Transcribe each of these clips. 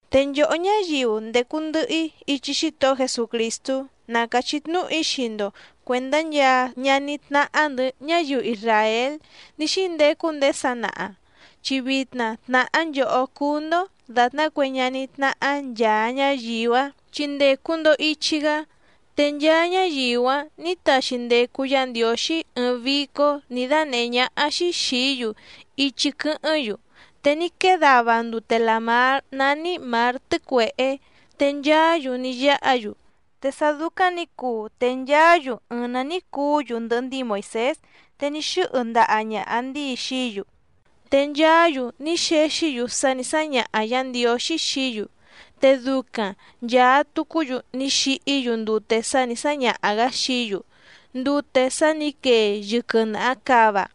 Te nchòhó ñáyiu ndècu ndɨhɨ‑í ichi Xítohó Jesucrìstú na càchí tnúhu‑í xii‑ndo cuèndá nchaa ñaní tnáhá‑ndɨ̌ ñáyiu isràél ní xíndecu ndéé sanaha, chi vitna tnàhá nchòhó cúú‑ndó dàtná cue ñaní tnáhá nchàa ñáyiu‑áⁿ chi ndècu‑ndo ichi‑gá. Te nchaa ñáyiu‑áⁿ nǐ taxi ndecu Yá Ndiǒxí ɨɨⁿ vícó nǐ dánèhé ñáhá‑xí xìí‑yu ichi quɨ́hɨ́ⁿ‑yu, te ní quée dava ndute làmár nání Mǎr Tɨ́cuèhé te nchaá‑yu ní yáha‑yu. Te sá dúcáⁿ nǐ cuu te nchaá‑yu ɨɨⁿ‑ná ní cuú‑yu ndɨhɨ ndíi Moìsés, te ní xɨ́hɨ ndaha ñàha ndíi xií‑yu. Te nchaá‑yu ní xexí‑yu sá nǐ sáñaha Yǎ Ndiǒxí xií‑yu. Te ducaⁿ nchàa tucú‑yu ní xihí‑yu ndute sá nǐ sáñaha‑gǎ xií‑yu, ndute sá nǐ quee yɨquɨ nàha cava.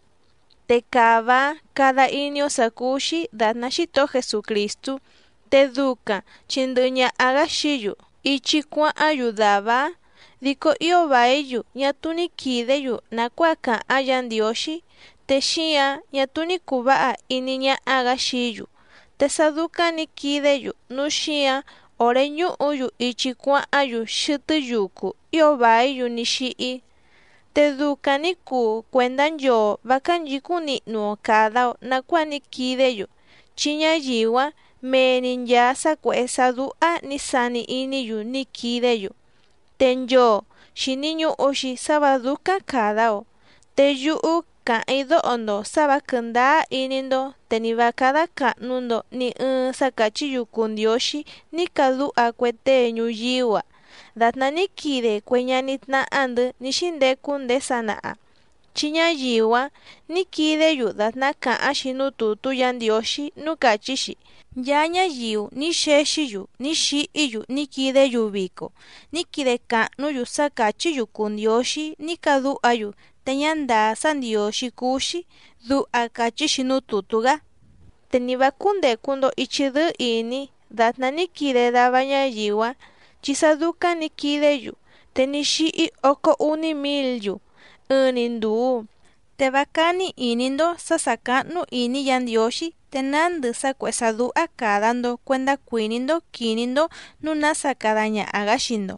Te cava‑áⁿ cada iní‑ó sǎ cúú‑xí dàtná Xítohó Jesucrìstú te ducaⁿ chi ndɨhɨ ñaha‑gǎ xií‑yu ichi cuáháⁿ‑yu dàvá‑áⁿ. Dico ío vàí‑yu ñá túú ní quìdé‑yu nàcuáa càháⁿ Yǎ Ndiǒxí, te xíǎⁿ ñá túú ní cùu váha iní ñáhá‑gǎ xií‑yu. Te sá dúcáⁿ nǐ quidé‑yu núu xíǎⁿ òré ñúhǔ‑yu ichi cuáháⁿ‑yu xɨtɨ́ yucu ío vàí‑yu ní xíhí. Te ducaⁿ nǐ cuu cuèndá nchoo vǎ cánchǐcúⁿ nihnu‑o càda‑o nacuáa ní quidé‑yu, chi ñáyiu‑áⁿ mee‑ni nchàa sá cuèhé sá dúhá nǐ sani iní‑yu ní quidé‑yu. Te nchoo xìni ñuhu‑xi sá vǎ dúcáⁿ càda‑o. Te yúhú càháⁿ‑í dóho‑ndo sǎ vǎ quɨ̀ndáá iní‑ndó te ni vǎ cádá càhnu‑ndo ni ɨɨⁿ sá càchí‑yu cùu ndióxí ní cadúha cue tée ñuyíú‑a dàtná ní quide cue ñaní tnáhá‑ndɨ̌ ní xíndecu ndéé sanaha. Chi ñáyiu‑áⁿ nǐ quidé‑yu dàtná càháⁿ‑xi núú tùtú Yǎ Ndiǒxí núú càchí‑xi: “Nchaa ñáyiu ní xexí‑yu ní xihí‑yu ní quidé‑yu vico, ní quide càhnú‑yu sá càchí‑yu cùu ndióxí ní cadúha‑yu te ñá ndàá sá ndiǒxí cúú‑xí”, duha càchí‑xi núú tùtú‑gá. Te ni vǎ cúndècu‑ndo ichi dɨ́ɨ́ ìní dàtná ní quide dava ñáyiu‑áⁿ, chi sá dúcáⁿ nǐ quidé‑yu te ní xíhí ócó úní mǐl‑yu ɨɨⁿ‑ni ndùu. Te vá cání ìní‑ndó sǎ sà cáhnú ìní Yǎ Ndiǒxí te nándɨ sá cuèhé sá dúhá càda‑ndo cuendá cuìní‑ndó quìní‑ndó nǔu nása cada ñaha‑gǎ xii‑ndo,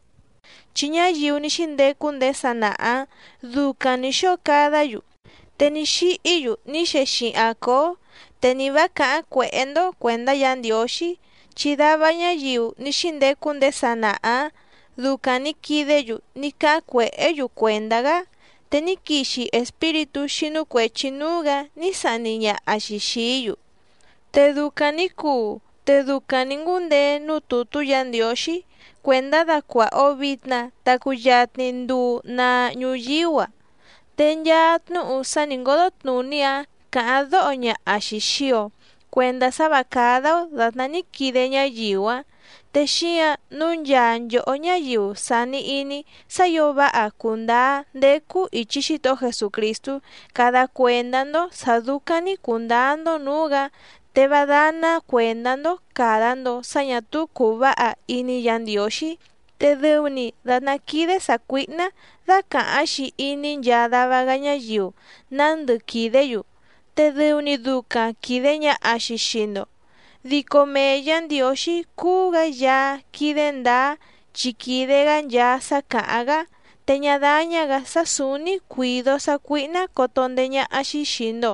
chi ñáyiu ní xíndecu ndéé sanaha‑ǎⁿ ducaⁿ nǐ xóo cadá‑yu, te ní xíhí‑yu ní xexihaⁿ cǒó. Te ni vǎ càháⁿ cuèhé‑ndó cuèndá Yǎ Ndiǒxí, chi dava ñáyiu ní xíndecu ndéé sanaha‑ǎⁿ ducaⁿ nǐ quidé‑yu ní cáháⁿ cuèhé‑yu cuèndá‑gá te ní quixi espíritú xínú cuèchi núú‑gǎ ní sahni ñaha‑xi xìí‑yu. Te ducaⁿ nǐ cuu te ducaⁿ nǐ ngúndeé núú tùtú Yǎ Ndiǒxí cuèndá dacuàha‑o vitna ta cuyatni nduu naa ñuyíú‑a. Te nchaa tnúhu sá nǐ ngódó tnùní‑áⁿ càháⁿ dóho ñaha‑xi xìi‑o cuendá sá vǎ cádá‑ó dàtná ní quide ñáyiu‑áⁿ. Te xíǎⁿ nǔu nchaa nchòhó ñáyiu sàni iní sá ǐo váha cùndáá ndécú ìchi Xítohó Jesucrìstú cada cuèndá‑ndó sǎ dúcáⁿ‑ní cùndáá‑ndó nǔú‑gǎ, te vá dáná cuèndá‑ndó càda‑ndo sá ñà túú cùu váha iní Yǎ Ndiǒxí. Te dɨu‑ni dàtná quídé sàcuíhná dácàháⁿ‑xi iní nchaa dava‑gá ñáyiu nándɨ quìdé‑yu, te dɨu‑ni ducaⁿ quìde ñaha‑xi xii‑ndo. Dico mee Yǎ Ndiǒxí cúú‑gǎ Yaá quídé ndǎá chi quìde‑gá nchaa sá càháⁿ‑gá, te ñá dáñá‑gǎ sá sǔúní cuǐdó sácuíhná coto ndeé ñáhá‑xí xìi‑ndo,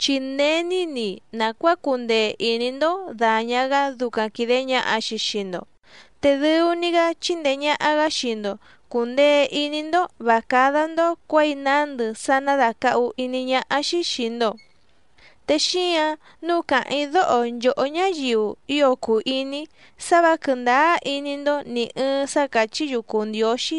chi není‑ni nàcuáa cùndee iní‑ndó dàña‑gá ducaⁿ quìde ñaha‑xi xii‑ndo. Te dɨu‑ni‑gá chindee ñàha‑gá xii‑ndo cùndee iní‑ndó vǎ cádá‑ndó cuěi nándɨ sá ná dàcahu iní ñáhá‑xí xìi‑ndo. Te xíǎⁿ nǔu càháⁿ‑í dóho nchòhó ñáyiu ío cùu iní‑í sá vǎ quɨ̀ndáá iní‑ndó nì ɨɨⁿ sá càchí‑yu cùu ndióxí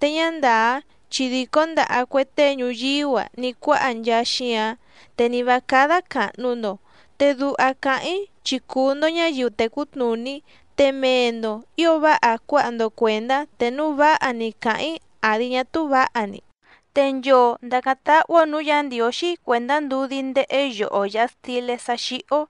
te ñá ndàá chi dìcó ndaha cue tée ñuyíú‑a ní cuáha nchaa xíǎⁿ, te ni vǎ cádá càhnu‑ndo. Te duha càháⁿ‑í chi cùu‑ndo ñáyiu tècú tnùní, te mee‑ndo ǐo váha cuáha‑ndo cuèndá te núu váha‑ni càháⁿ‑í àdi ñá túú vǎha‑ni. Te nchoo ndàcáⁿ táhú‑ó nǔú Yǎ Ndiǒxí cuèndá ndudí ndéhé yoho yàha stilé sá xíhí‑ó,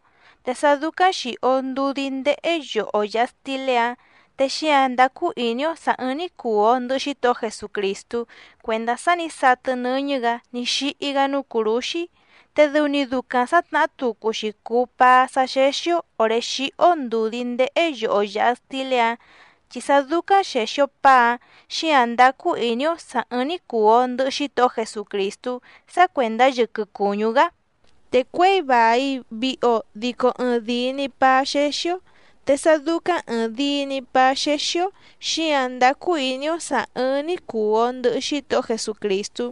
te sá dúcáⁿ xìhí‑ó ndùdí ndéhé yoho yàha stilé‑áⁿ, te xíǎⁿ ndácú ìní‑ó sǎ ɨ́ɨ́ⁿ‑ní cùu‑o ndɨhɨ Xítohó Jesucrìstú cuèndá sá nǐ satɨ nɨ́ñɨ́‑gǎ ní xíhí‑gá núú cùrúxí, te dɨu‑ni ducaⁿ sǎtnahá tucu‑xi cùu paá sá xéxí‑ó òré xíhí‑ó ndùdí ndéhé yoho yàha stilé‑áⁿ, chi sá dúcáⁿ xèxi‑o paá‑áⁿ xíǎⁿ ndácú ìní‑ó sǎ ɨ́ɨ́ⁿ‑ní cùu‑o ndɨhɨ Xítohó Jesucrìstú sá cuèndá yɨquɨ cùñú‑gá. Te cuěi vài vihi‑o dico ɨɨⁿdìi‑ni paá xéxí‑ó, te sá dúcáⁿ ɨ̀ɨⁿdii‑ni paá xéxí‑ó xíǎⁿ ndácú ìní‑ó sǎ ɨ́ɨ́ⁿ‑ní cùu‑o ndɨhɨ Xítohó Jesucrìstú.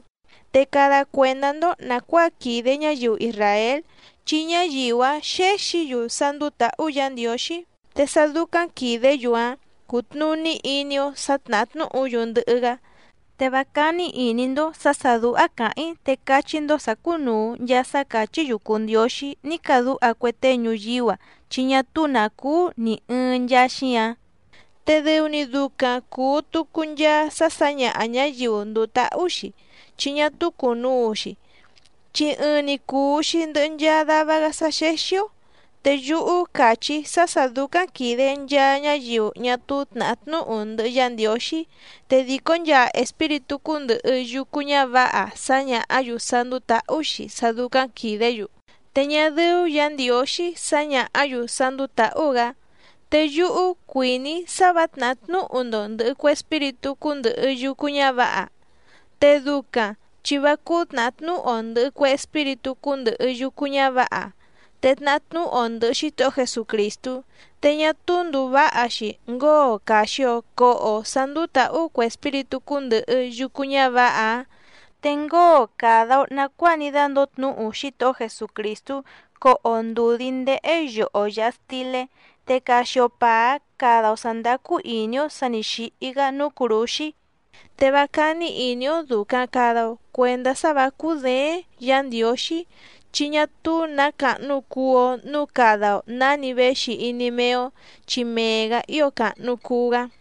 Te cada cuèndá‑ndó nàcuáa quìde ñáyiu isràél, chi ñáyiu‑áⁿ xéxǐ‑yu sá ndúú tǎhú Yǎ Ndiǒxí. Te sá dúcáⁿ quìdé‑yu‑áⁿ cútnùní iní‑ó sǎ tnàhá tnúhu‑yu ndɨhɨ‑gá. Te vá cání ìní‑ndó sǎ sà dúhá càháⁿ‑í te cachí‑ndó sǎ cùnuu nchaa sá càchí‑yu cùu ndióxí ní cadúha cue tée ñuyíú‑a chi ñá túú nǎ cúú nì ɨɨⁿ nchaa xíǎⁿ. Te dɨu‑ni ducaⁿ cùu tucu nchaa sá sǎñaha ñǎyiu ndùu táhú‑xi chi ñá túú cùnuu‑xi, chi ɨɨⁿ‑ni cùu‑xi ndɨhɨ nchaa dava‑gá sá xéxí‑ó. Te yúhú càchí‑í sá sǎ dúcáⁿ quìde nchaa ñáyiu ñá túú tnàhá tnúhu ndɨhɨ Yá Ndiǒxí, te dìcó nchaa espíritú cúndɨ̀hɨ yucu ñávǎha sáñàhá‑yu sá ndúú tǎhú‑xi sá dúcáⁿ quìdé‑yu. Te ñá dɨ́ú Yǎ Ndiǒxí sǎñàhá‑yu sá ndúú tǎhú‑gǎ. Te yúhú cuìní‑í sá vǎ tnàhá tnúhu‑ndo ndɨ̀hɨ cue espíritú cúndɨ̀hɨ yucu ñávǎha. Te ducaⁿ chi vá cúú tnàhá tnúhu‑o ndɨ̀hɨ cue espíritú cúndɨ̀hɨ yucu ñávǎha te tnahá tnúhu‑o ndɨ̀hɨ Xítohó Jesucrìstú, te ñá túú ndùu váha‑xi ngóo càxi‑o coho‑o sá ndúú tǎhú cue espíritú cúndɨ̀hɨ yucu ñávǎha‑áⁿ, te ngóo càda‑o nacuáa ní dándǒo tnúhu Xítohó Jesucrìstú coho‑o ndùdí ndéhé yoho yàha stilé, te caxi‑o pàá cada‑o sǎ ndácú ìní‑ó sǎ nǐ xíhí‑gá núú cùrúxí. Te vá cání ìní‑ó dùcaⁿ cada‑o cuendá sá vǎ cúděéⁿ Yǎ Ndiǒxí, chi ñá túú nǎ càhnu cuu‑o núu cada‑o nǎni véxi iní méé‑ó, chi mee‑gǎ ío càhnu cuu‑gá.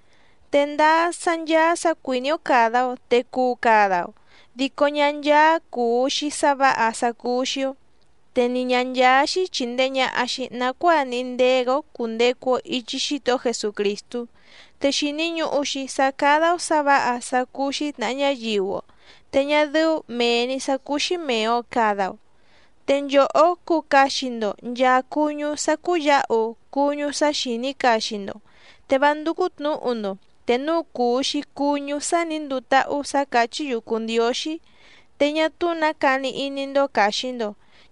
Te ndáá sá ncháá sǎ cuìní‑ó càda‑o te cuu cada‑o dico ñá ncháá cùu‑xi sá vǎha sá cúú‑xí‑ó, te ni ñǎ ncháá‑xí chìndee ñaha‑xi nacuáa níhí ndéé‑gǎ‑ó cùndecu‑o ichi Xítohó Jesucrìstú. Te xìni ñuhu‑xi sá cádá‑ó sǎ vǎha sá cúú‑xí tnàha ñáyiu‑o te ñá dɨ́ú mèe‑ni sá cúú‑xí mèe‑o cada‑o. Te nchòhó cuu caxi‑ndo nchàa cuñú sá cúyǎhu cuñú sá xìní caxi‑ndo, te vá ndúcú tnǔhu‑ndo te núu cùu‑xi cuñú sá nǐ nduu táhú sǎ càchí‑yu cùu ndióxí. Te ñá túú nǎ cani iní‑ndó càxi‑ndo,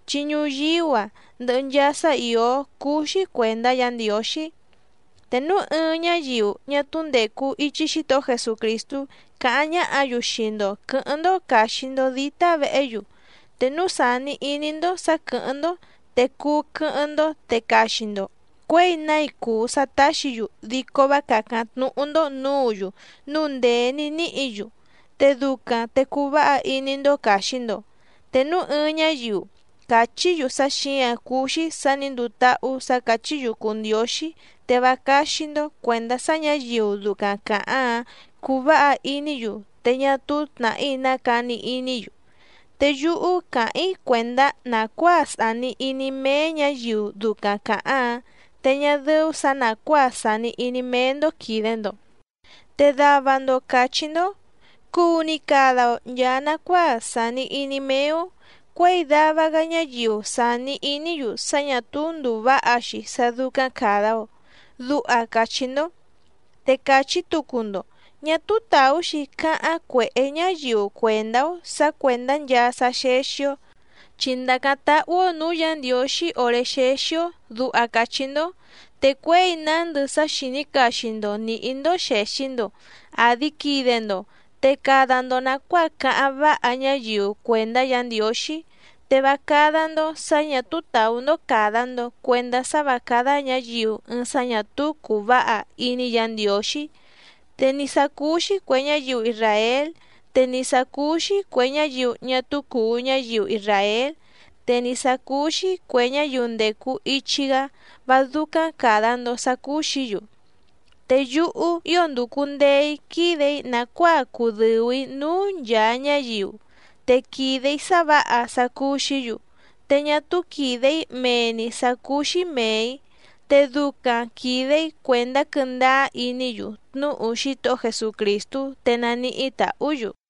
chi ñuyíú‑a ndɨhɨ nchaa sá ìó cúú‑xí cuèndá Yǎ Ndiǒxí. Te núu ɨɨⁿ ñáyiu ñá túú ndècu ichi Xítohó Jesucrìstú càháⁿ ñáhǎ‑yu xii‑ndo quɨ̌hɨ́ⁿ‑ndó càxi‑ndo dítá vehé‑yu, te núu sàni iní‑ndó sǎ quɨ̀hɨ́ⁿ‑ndó te cuu quɨ́hɨ́ⁿ‑ndó te caxi‑ndo cuěi nái cùu sá táxǐ‑yu dico vá càcáⁿ tnúhú‑ndó nǔǔ‑yu núu ndèé ní níhǐ‑yu, te ducaⁿ te cuu váha iní‑ndó càxi‑ndo. Te núu ɨɨⁿ ñáyiu càchí‑yu sá xǐǎⁿ cúú‑xí sǎ nǐ nduu táhú sǎ càchí‑yu cùu ndióxí te vá cáxí‑ndó cuèndá sá ñǎyiu ducaⁿ càháⁿ‑áⁿ cuu váha iní‑yu te ñá túú tnàhí ná cani iní‑yu. Te yúhú càháⁿ‑í cuèndá nàcuáa sàni iní méé ñǎyiu ducaⁿ càháⁿ‑áⁿ te ñá dɨ́ú sǎ nàcuáa sàni iní méé‑ndó quìde‑ndo. Te dava‑ndo càchí‑ndó: “Cuu‑ni cada‑o nchàa nacuáa sàni iní méé‑ó cuěi dava‑gá ñáyiu sàni iní‑yu sá ñà túú ndùu váha‑xi sá dúcáⁿ càda‑o”, duha càchí‑ndó. Te càchí tucu‑ndo: “Ñá túú tàú‑xi cáháⁿ cuèhé ñáyiu cuèndá‑ó sǎ cuèndá nchaa sá xéxí‑ó chi ndàcáⁿ táhú‑ó nǔú Yǎ Ndiǒxí òré xéxí‑ó”, duha càchí‑ndó. Te cuěi nándɨ sá xìní caxi‑ndo nìhí‑ndó xèxi‑ndo àdi quide‑ndo, te cada‑ndo nàcuáa cáháⁿ váha ñáyiu cuèndá Yǎ Ndiǒxí. Te vá cádá‑ndó sǎ ñà túú tàú‑ndó càda‑ndo cuendá sá vǎ cádá ñǎyiu ɨɨⁿ sá ñà túú cùu váha iní Yǎ Ndiǒxí. Te ni sǎ cúú‑xí cuè ñáyiu isràél, te ni sǎ cúú‑xí cuè ñáyiu ñá túú cùu ñáyiu isràél, te ni sǎ cúú‑xí cuè ñáyiu ndècu ichi‑gá vá dúcáⁿ càda‑ndo sá cúú‑xǐ‑yu. Te yúhú ío ndùcu ndee‑í quídè‑í nàcuáa cudɨ̀u‑í núú nchàa ñáyiu, te quìde‑í sá vǎha sá cúú‑xǐ‑yu, te ñá túú quìde‑í mee‑ni sǎ cúú‑xí mèe‑í. Te ducaⁿ quìde‑í cuèndá quɨ́ndáá iní‑yu tnúhu Xítohó Jesucrìstú te naníhí tàhú‑yu.